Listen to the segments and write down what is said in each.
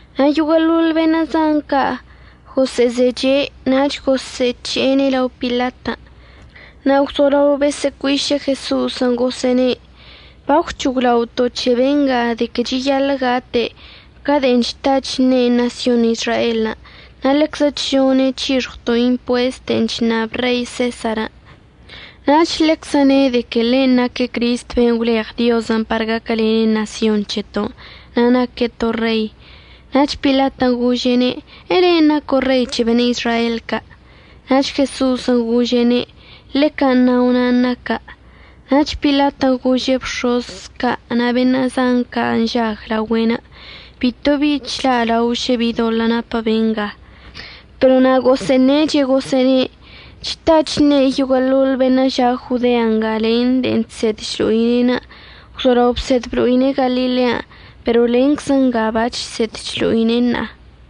Na' yoguə'əḻol beṉə' zan ca' gosə'əzeche' nach gosə'əc̱he'ene' lao Pilatən'. Na' gwzolao bosə'əcuiše' Jeso'osən' gosə'əne': ―Bagwc̱hoglaoto' c̱he benga de que cheyaḻə' gate' ca de'en chta chṉe' ṉasyon Izraelən'. Na' ḻeczə chžone' c̱hixɉwto' impuest de'en chṉab Rei Sesarən'. Nach ḻeczə ne' de que ḻe' naque' Cristən' ben' gwleɉ Diozən' par gaquəlene' ṉasyon c̱heto'onə' na' naque' to rei. Nach Pilatən' gože'ene': ―¿Elen' naco' rei c̱he beṉə' Izrael ca'? Nach Jeso'osən' gože'ene': ―Ḻe can' nao' nan' naca'. Nach Pilatən' gože' bx̱oz ca' na' beṉə' zan ca' nžag laogüe'enə': ―Bitobi chla'alaon šə bi doḻə' napə benga. Pero na' gosə'əṉeche' gosə'əne': ―Chta chṉe' yoguə'əḻoḻ beṉə' ža' Jodea nga len de'en chsed chlo'ine'. Gwzolao bsed blo'ine' Galilean' pero lenczə nga bachsed chlo'ine' ṉa'a.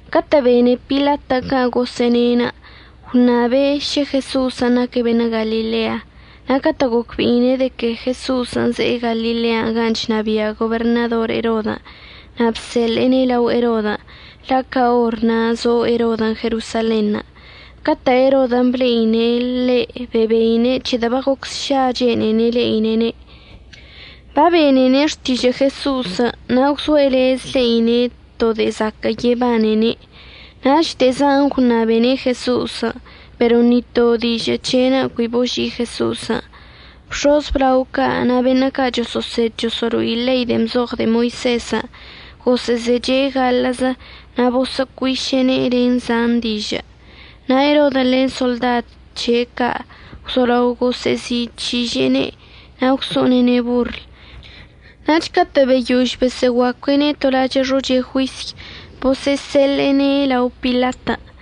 Catə' bene Pilatən' can' gosə'əne', gwṉabe' šə Jeso'osən' naque' beṉə' Galilea. Na' catə' gocbe'ine' de que Jeso'osən' ze'e Galilean' gan' chnabia' goberṉador Erodən', na' bseḻe'ene' lao Erodən', la' ca or na' zo Erodən' Jerosalenṉə'. Catə' Erodən' ble'ine' ḻe' bebeine' c̱hedə' bagoc sša chene'ene' le'ine'ene'. Babenene' xtižə' Jeso'osən' na' gwzoe' lez le'ine' to de'e zaquə' yebanene'. Nach de'e zan gwṉabene' Jeso'osən', pero ni to dižə' c̱he'enə' cui boži'i Jeso'osən'. Bx̱oz əblao ca' na' beṉə' ca' choso'osed choso'olo'i ḻei de'en bzoɉ de'e Moisezən' gosə'əzeche' gaḻə'əzə na' bosə'əcuiše'ene' len zan dižə'. Na' Erodən' len soḻdad c̱he' ca' gwzolao gosə'əzi'ic̱hiže'ene' na' gwso'onene' borl. Nach catə' beyož bosə'əguacue'ene' to lachə' xoche juisy, bosə'əseḻe'ene' lao Pilatən'.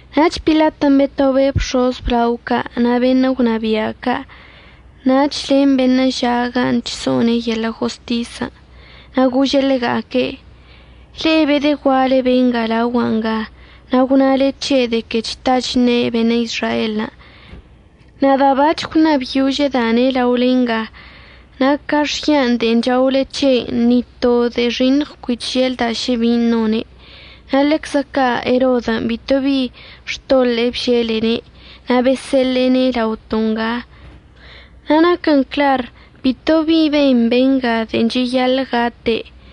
Nach Pilatən' betobe' bx̱oz əblao ca' na' beṉə' gwnabia' ca' nach len beṉə' ža' gan' chso'one' yeḻə' jostisən'. Na' gože' ḻega'aque': ―Le'e bedəgua'ale benga laogua' nga, na' gwnale c̱he' de que chta chṉe' beṉə' Izraelən'. Nada' bac̱h gwṉabyožəda'ane' laole nga, na' ca xyan' de'en chaole c̱he', ni to de'e xiṉɉ cui chželda' šə bin' none'. Na' ḻeczə ca' Erodən' bitobi xtoḻe'e bželene', na' bosseḻe'ene' laoto' nga. Na' naquən clar bitobi ben benga de'e cheyaḻə' gate'.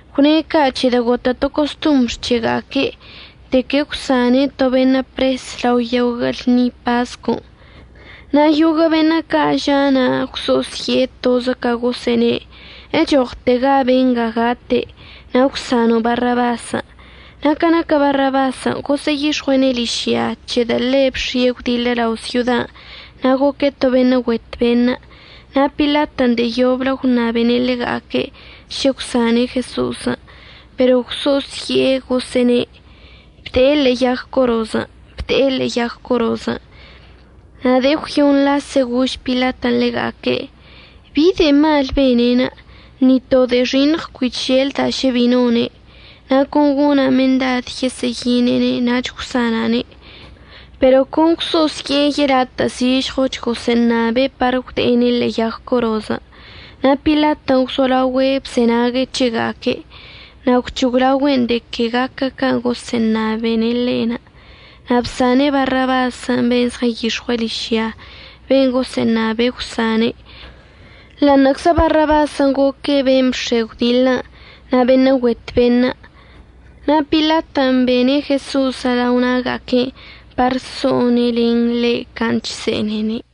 Gwne' ca' c̱hedə' gotə' to costombr c̱hega'aque' de que əgwsane' to beṉə' pres lao yoguə' lṉi pascon'. Na' yoguə' beṉə' ca' ža' na' gwso'osye'e, tozə ca gosə'əne': ―¡Echoɉtega benga gate', na' əgwsano' Barrabasən'! Na' ca naquə Barrabasən' gosə'əyix̱ɉue'ene' ližya c̱hedə' ḻe' bx̱ie' gwdiḻə lao syodan' na' goque' to beṉə' güet beṉə'. Na' Pilatən' de'e yoblə gwṉabene' ḻega'aque' šə əgwsane' Jeso'osən'. Pero gwso'osye'e gosə'əne': ―¡Bde'e ḻe'e yag corozən'! ¡Bde'e ḻe'e yag corozən'! Na' de'e əgwyoṉ lase gož Pilatən' ḻega'aque': ―¿Bi de'e mal bene'enə'? Ni to de'e xiṉɉ cui cheželda' šə bin' none'. Na' con gona' mendad yesə'əyine'ene' nach əgwsana'ane'. Pero con gwso'osye'e yelatə' zižɉoch gosə'əṉabe' par əgwde'ene' ḻe'e yag corozən'. Na' Pilatən' gwzolaogüe' bzenague' c̱hega'aque'. Na' gwc̱hoglaogüe'en de que gaquə can' gosə'əṉabene' ḻe'. Na' bsane' Barrabasən' ben' zɉənyix̱ɉue' ližyan' ben' gosə'əṉabe' əgwsane' ḻa'aṉə'əczə Barrabasən' goque' ben' bx̱e gwdiḻən' na' beṉə' güet beṉə'. Na' Pilatən' bene' Jeso'osən' lao na'aga'aque'enə' par so'one' len ḻe' can' chse'enene'.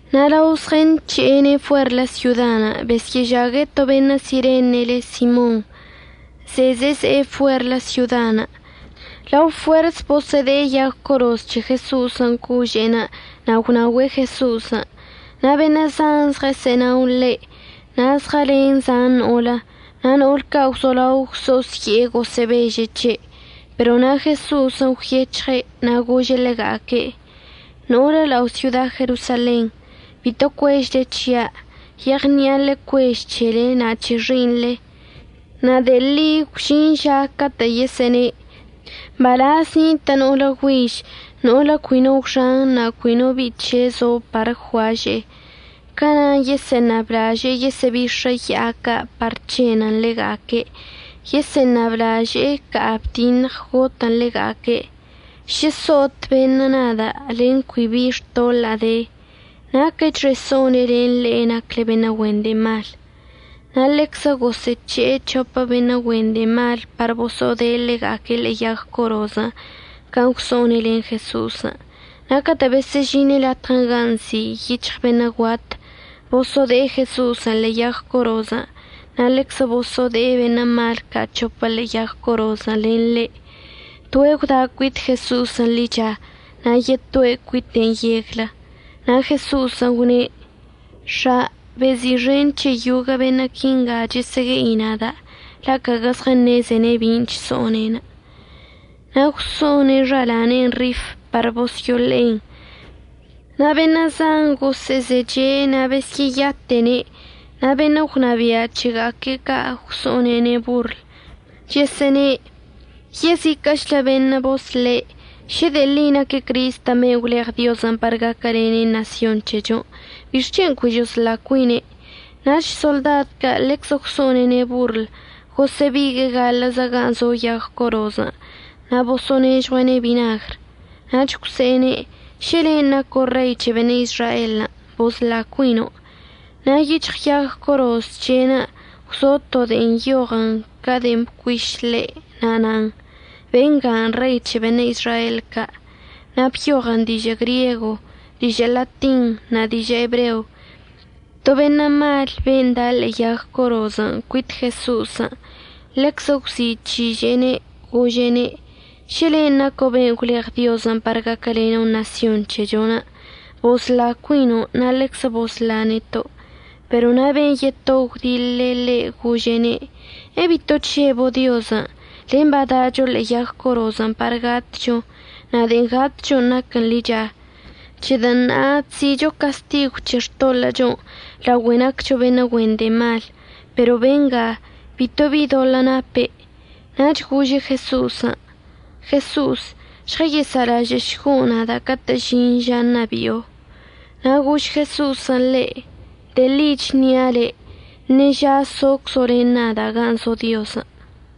Na' lao zɉənc̱he'ene' fuerlə syodan' besyə'əžague' to beṉə' Sirene le' Simon, ze'e zeze'e fuerlə syodan'. Ḻa fuers bosə'əde'e yag coroz c̱he Jeso'osən' cože'enə' na' gwnaogüe' Jeso'osən'. Na' beṉə' zan zɉəsə'ənao ḻe' na' zɉəlen zan no'olə. Na' no'ol ca' gwzolao gwso'osye'e gosə'əbeže' c̱he'. Pero na' Jeso'osən' gwyec̱hɉe' na' gože' ḻega'aque': ―No'olə lao' syoda Jerosalen, bito cuežle c̱hia', yeɉni'a ḻecuež c̱hele na' c̱he xi'iṉle. Na' de'e ḻi gwžin ža catə' yesə'əne': “Mbalaz nitə' no'olə güiž no'olə cui no gwxan na' cui no bi'i c̱he' zo par əgguaže'e.” Ca na' yesə'əṉablaže'e yesə'əbix̱ə ya'a ca' par c̱henən ḻega'aque', yesə'əṉablaže'e əca'a bdiṉɉ gotən ḻega'aque'. Šə so'ot beṉə' nada' len cui bi xtoḻa'a de, ¡naquəchxe so'one' len le'e nacle beṉə' güen de'e malən'! Na' ḻeczə gosə'əc̱he'e c̱hopə beṉə' güen de'e malən' par boso'ode'e ḻega'aque' ḻe'e yag corozən' can' gwso'one' len Jeso'osən'. Na' catə' besə'əžine' latɉə ganə' nzi' “Yic̱hɉ Beṉə' Guat”, boso'ode'e Jeso'osən' ḻe'e yag corozən', na' ḻeczə boso'ode'e beṉə' mal ca' c̱hopə ḻe'e yag corozən' len ḻe'. Toe' gwda' cuit Jeso'osən' ḻicha na' yetoe' cuite' yeglə. Na' Jeso'osən' gwne': ―X̱a, bezi'ixen c̱he yoguə' beṉə' quinga chəsə'əgue'i nada', la' caguə zɉəṉezene' bin' chso'one'enə'. Na' gwso'one' xala'ane'enə' rif par bosyo'oḻe'en. Na' beṉə' zan gosə'əzeche' na' besyə'əyate'ene'. Na' beṉə' gwnabia' c̱hega'aque' ca' gwso'onene' borl, chəsə'əne': ―Yeziquə'əchlə beṉə' bosle'. Šə de'e ḻi naque' Cristən' ben' gwleɉ Diozən' par gaquəlene' ṉasyon c̱hechon', ¿bixc̱hen' cui chosla cuine'? Nach soḻdad ca' ḻeczə gwso'onene' borl gosə'əbigue'e gaḻə'əzə gan' zo yag corozən' na' boso'onežɉue'ene' binagr. Nach gwse'ene': ―Šə len' naco' Rei c̱he beṉə' Izraelən', bosla cuino'. Na' yic̱hɉ yag coroz c̱he'enə' gwzo to de'en nyoɉən ca de'en bcuiš ḻe', na' nan: “Bengan' Rei c̱he beṉə' Izrael ca'.” Na' byoɉən dižə' griego, dižə' latin na' dižə' ebreo. To beṉə' mal ben' da' ḻe'e yag corozən' cuit Jeso'osən' ḻeczə gwzi'ic̱hiže'ene', gože'ene': ―Šə len' naco' ben' gwleɉ Diozən' par gaquəleno' ṉasyon c̱hechon', bosla cuino' na' ḻeczə bosla neto'. Pero na' ben' yeto gwdiḻe' ḻe' gože'ene': ―¿Ebito chžebo' Diozən'? len badacho ḻe'e yag corozən' par gatcho. Na' de'en gatcho naquən ḻicha, c̱hedə' ṉa'a chzi'icho castigw c̱he xtoḻə'əchon' laogüe naccho beṉə' güen de'e malən'. Pero benga bitobi doḻə' nape'. Nach gože' Jeso'osən': ―Jeso'os, žɉəsa'alažə'əšgo' nada' catə' əžin ža ṉabi'o. Na' gož Jeso'osən' ḻe': ―De'e ḻi əchnia' le', ṉeža soczo' len nada' gan' zo Diozən'.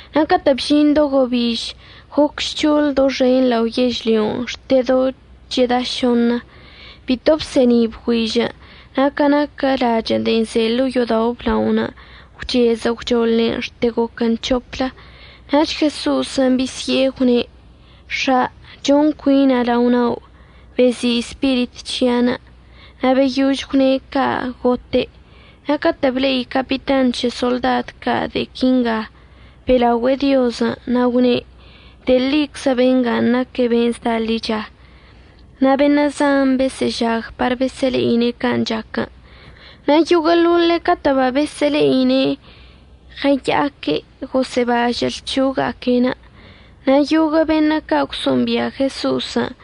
Na' catə' bžin do gobiž goc žc̱hoḻ doxen lao yežlyon' xte do cheda šoṉə. Bito bse'eni' bgüižən'. Na' ca naquə lachə'ən de'en ze ḻo'o yo'odao' əblaonə' gwchezə gwchoḻen xte goquən c̱hoplə. Nach Jeso'osən' bisye'e gwne': ―X̱a, chon cuina' lao na'o. Bezi' spirit c̱hi'anə'. Na' beyož gwne' ca' gote'. Na' catə' ble'i capitan c̱he soḻdad ca' de'e quinga, be'elaogüe'e Diozən' na' gwne': ―De'e ḻiczə benga naque' beṉə' zda ḻicha. Na' beṉə' zan besə'əžag par besə'əle'ine' can' chac. Na' yoguə'əḻoḻe' catə' babesə'əle'ine'en ɉəya'aque' gosə'əbažə' lc̱ho'oga'aque'enə'. Na' yoguə' beṉə' ca' gwso'ombia' Jeso'osən'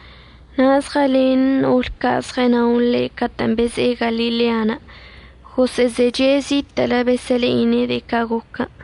na' zɉəlen no'olə ca' ɉəsə'ənao ḻe' catə'ən beze'e Galilean' gosə'əzeche' zitə'ələ besə'əle'ine' de'e ca' goquən'.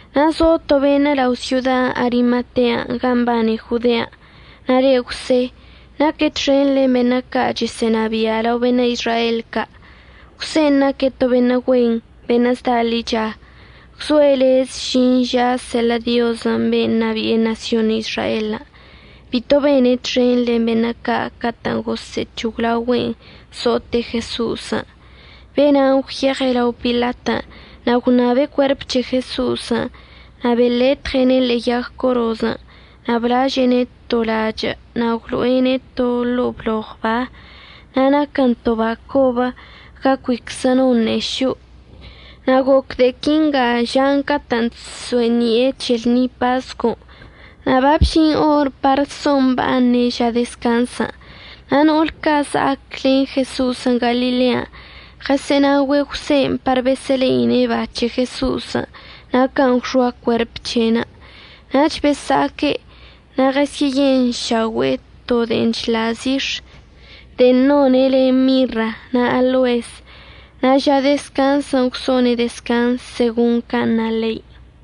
Na' zo to beṉə' lao' syoda Arimatea gan' mbane Jodean' na' le' Jwse. Naque' txen len beṉə' ca' chesə'ənabia' lao beṉə' Izrael ca'. Jwsen' naque' to beṉə' güen, beṉə' zda ḻicha. Gwzoe' lez əžin ža seḻə' Diozən' beṉə' ṉabi'e ṉasyon Izraelən'. Bito bene' txen len beṉə' ca' catə'ən gosə'əc̱hoglaogüe'en so'ote' Jeso'osən'. Be'ena' gwyeɉe' lao Pilatən' na' gwṉabe' cuerp c̱he Jeso'osən'. Na' beletɉe'ene' ḻe'e yag corozən' na' blaže'ene' to lachə' na' gwlo'ene' to ḻo'o bloɉ ba. Na' naquən to ba cobə ga cuiczə no no ṉe'e šo'o. Na' goc de'e quinga žan' catə'ən chso'eni'e c̱he lṉi pascon', na' babžin or par so'omba'aṉe' ža dezcanzən'. Na' no'ol ca' za'ac len Jeso'osən' Galilean' ɉəsə'ənaogüe' Jwsen' par besə'əle'ine' ba c̱he Jeso'osən' na' can' gwxoa cuerp c̱he'enə'. Nach besa'aque' na' ɉəsyə'əyenšaogüe'e to de'en chḻa' zix̱ de'en none' len mirra na' aloes. Na' ža dezcanzən' gwso'one' dezcanz segon can' na ḻein'.